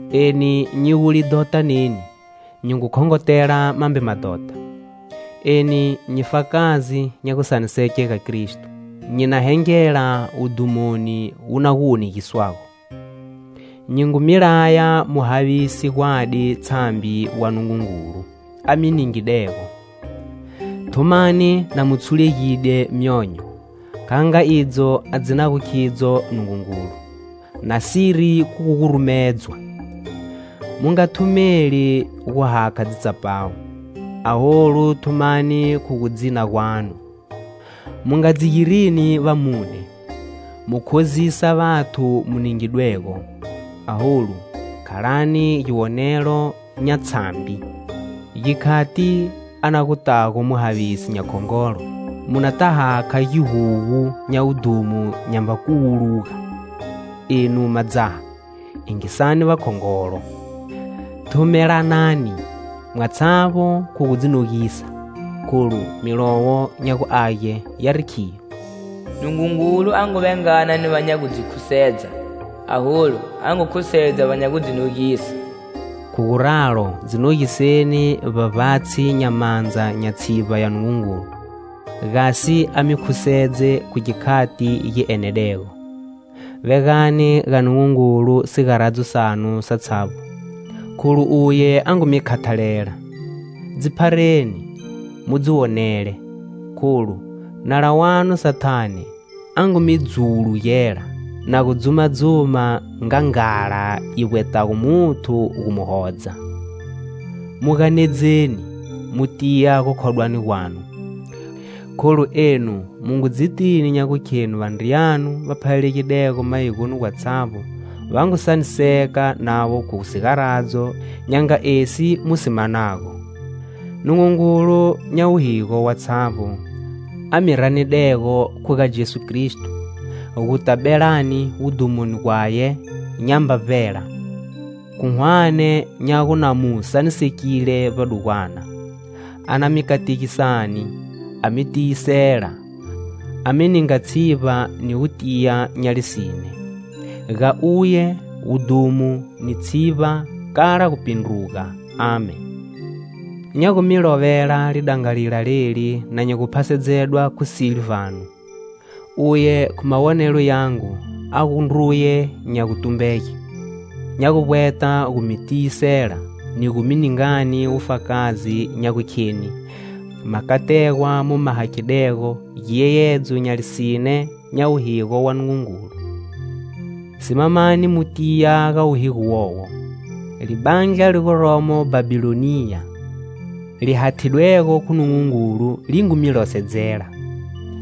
Eni nyi gu lidhota neni, nyi ngu khongotela mambe madhota. Eni nyi fakazi nya gusaniseke ga Kristo, nyi na hengela wudhumoni wu na gu wonegiswago. Nyi ngu mi laya mu havise gwadi tshambi wa Nungungulu a mi ningidego; thumani na mu tshulegide myonyo kha nga idzo a dzinago khidzo Nungungulu; nasiri khu gu gurumedzwa. Mu nga thumeli gu hakha dzitsapawu. Aholu thumani khu gu dzina gwanu. Mu nga dzi girini vamune, mu khozisa vathu mu ningidwego, aholu khalani giwonelo nya tshambi. Gikhati a na gutago Muhavisi nya khongolo, mu nata hakha gihugu nya wudhumo nyamba kuwuluga. Enu madzaha, yingisani vakhongolo. Thumelanani mwatshavbo khu gu dzi nogisa, kholu Milowo nya gu Age yari khiyo: "Nungungulu a ngu vengana ni va nya gu dzi khusedza, aholu a ngu khusedza va nya gu dzi nogisa." Khu guralo, dzi nogiseni vbavbatshi nya mandza nya tshivba ya Nungungulu, gasi a mi khusedze khu gikhati gi enedego. Vegani ga Nungungulu sigaradzo sanu satshavbo, kholu uye a ngu mi khathalela. Dzi phareni, mu dzi wonele, kholu, nala wanu Sathane a ngu mi dzuwulugela na gu dzuma-dzuma nga nghala yi vbwetego muthu gu mu hodza. Mu ganedzeni, mu tiya gukhodwani gwanu, kholu enu mu ngu dzitini nya gukhenu vandriyanu va phalalegidego mayigoni gwatshavbo va ngu saniseka navo khu sigaradzo nya nga esi mu si manago. Nungungulu nya wuhigo watshavbo a mi ranidego khu ga Jesu Kristo, guta belani wudhumoni gwaye nyamba vbela, khu hwane nya gu na mu sanisekile vbadugwana, a na mi kategisani, a mi tiyisela, a mi ninga tshivba ni gutiya nya lisine. Ga uye, wudhumo ni tshivba kala gupindruga! Amen. Nya gu mi lovela lidangalila leli na nyi gu phasedzedwa khu Silvano, uye khu mawonelo yangu a gu ndruye nya gutumbege. Nya gu vbweta gu mi tiyisela ni gu mi ningani wufakazi nya gukheni makategwa mu ma hakhidego giyeyedzo nya lisine nya wuhigo wa Nungungulu. Simamani mu tiya ga wuhigo wowo. Libandla li guromo Bhabhiloniya li hathidwego khu Nungungulu li ngu mi losedzela.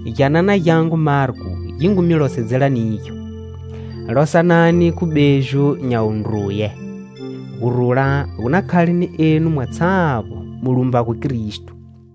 Gyanana gyangu Marko, gi ngu mi losedzela nigyo. Losanani khu beju nya wundruye. Gurula gu na khale ni enu mwatshavbo mu lumbago Kristo.